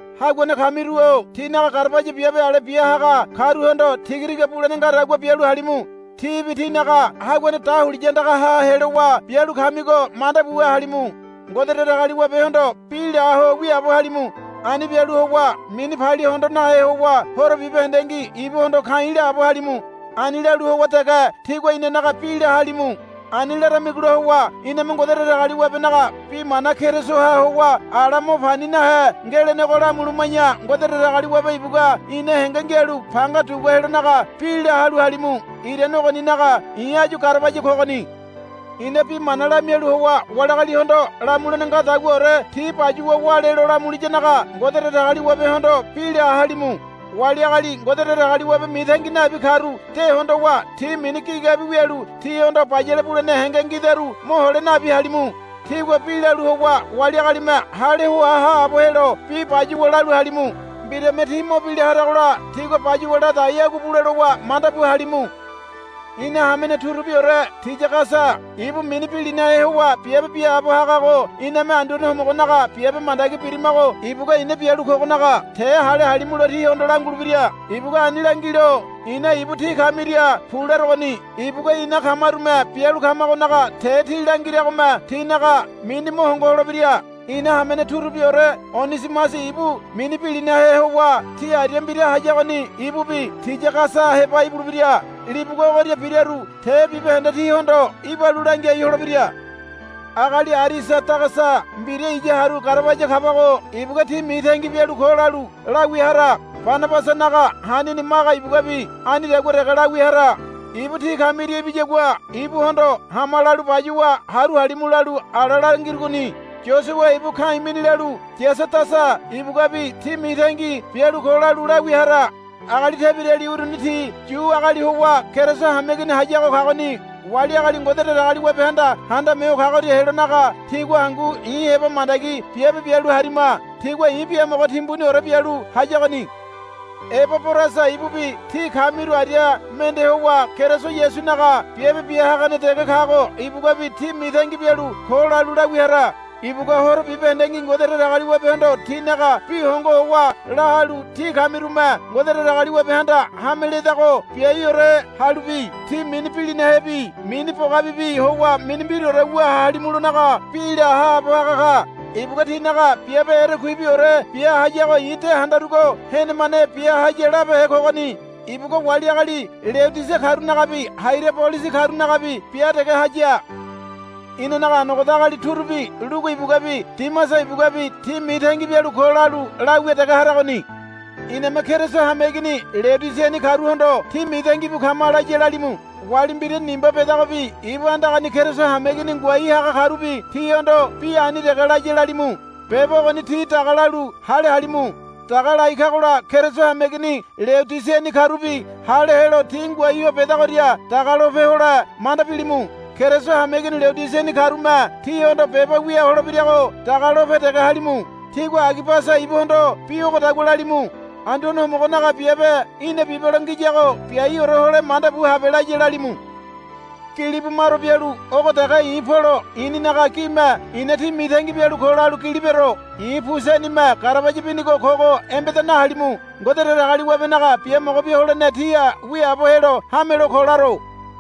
Haguane kamiru-o tínaga garabaya biabe ale bia haga karuhondo tiga tiga bulene ngadagua bialu halimu. Tíbi tínaga Haguane dahuliya andagaha helowa bialu kamigo manda buwa halimu. Ngode Datagaliwabehondo bi la ho wiaabo halimu. Ani bialu howa mini palia hondo nahe howa horo bibahendengi ibuhondo ka̱i̱ laabo halimu. Ani lalu howa dege tígua inanaga bi la halu halimu. Ani laramigola howa iname Ngode Datagaliwabenaga bi mana Kerisoha howa ala mo pani nahe ngelenego lamuluma̱ya Ngode Datagaliwabe ibugua ina henge ngialu panga dugua helonaga bi la halu halimu. Irane ogoninaga i̱ áyu garabaya kogoni. I̱na bi mana lamialu howa wali agalihondo lamulene ngadaguaore ti bayuwa wálelo lamuliyanaga Ngode Datagaliwabehondo bi la halimu. Wali agali Ngode Datagaliwabe mitangi nabi karu de hondowa tí mini gigabi wialu tihondo bayale bulene henge ngidaru mohole nabi halimu. Tígua bi lalu howa wali agalime hale hoa haabo helo bi bayuwa lalu halimu. Mbirame tí mo bila haragola tígua bayuwa ladai agua bule lowa manda bu halimu. Ina hamene turubiore Tiyagasa ibu mini bilinahe howa biabe biaabo hagago iname Anduane Homogonaga biabe mandagi birimago ibugua i̱na bialu kogonaga te hale halimulo tíhondo langulebira. Ibugua ani langilo i̱na ibu tí kamiria pu larogoni. Ibugua ina kamarume bialu kamagonaga te tí langiragome tínaga mini mo hongo holebira. Ina hamene turubiore Onisimasi ibu mini bilinahe howa tí aria mbira hayagoni ibubi Tiyagasa heba ibulebira. Libugua ogoria biraru te bibahende tí hondo ibalu langiai holebira. Agali Arisadagasa mbira iya haru garabaya kabago ibugua, Tí mitangi bialu ko, lalu lawia hara. Banabasanaga hanini Maga ibuguabi anidagua dege lawia hara. Ibu tí kamiria ibiyagua ibuhondo, Hama, lalu bayuwa haru halimu lalu ala langirugoni. Yosua ibu ka̱i̱ mini lalu Yasadasa ibuguabi, Tí mitangi bialu ko, lalu lawia hara. Agali tebirali uruni ti Yu agali howa Keriso hameigini hayago kagoni. Wali agali Ngode Datagaliwabehanda Handame Ho Kagoria helonaga tigua hangu i̱ heba mandagi biabe bialu harima. Tigua i̱ biamogo timbuniore bialu hayagoni. Ebaborasa ibubi tí kamiru aria mende howa Keriso Yasunaga biabe bia hagane dege kago ibuguabi, Tí mitangi bialu ko, lalu lawia hara. Ibugua horo bibahendengi Ngode Datagaliwabehondo tínaga bi hongo howa la halu tí kamirume Ngode Datagaliwabehanda hame ledago biaiore halubi tí mini bilinahebi mini bogabibi howa mini mbiraore wu halimulonaga bi la haabo haga ka. Ibugua tínaga biabe erekuibiore bia hayago i̱ de handarugo henemane bia haya labehe kogoni. Ibugua wali agali Leodisia karunagabi Hairabolisi karunagabi bia dege haya. Inanaga anogoda agali turubi Lugu ibuguabi Dimasa ibuguabi, Tí mitangi bialu ko, lalu lawia dege haragoni. Iname Keriso hameigini Leodisiani karuhondo, Tí mitangi bu kama, laya lalimu. Wali mbira Nimba bedagobi ibu andagani Keriso hameigini ngoai haga karubi tíhondo bi ani dege laya lalimu. Beba ogoni tí daga lalu hale halimu. Daga lai kagola Keriso hameigini Leodisiani karubi hale helo ti ngoai ho bedagoria daga lope hole manda bilimu. Keriso hameigini Leodisiani karume tíhondo beba wia holebirago daga lope dege halimu. Tígua Agibasa ibuhondo bi ogodagua lalimu. Anduane Homogonaga biabe í̠na bibelo ngiyago biaiore hole manda bu habe, laya lalimu. Gili bumaro bialu ogo dege i̱ Polo i̱ninaga gime i̱na tí mitangi bialu ko, lalu gili bero. I̱ pu senime garabaya binigo kogo embeda nahalimu. Ngode Datagaliwabenaga biamogo bia holene tíha wiaabo helo hamelo ko laro.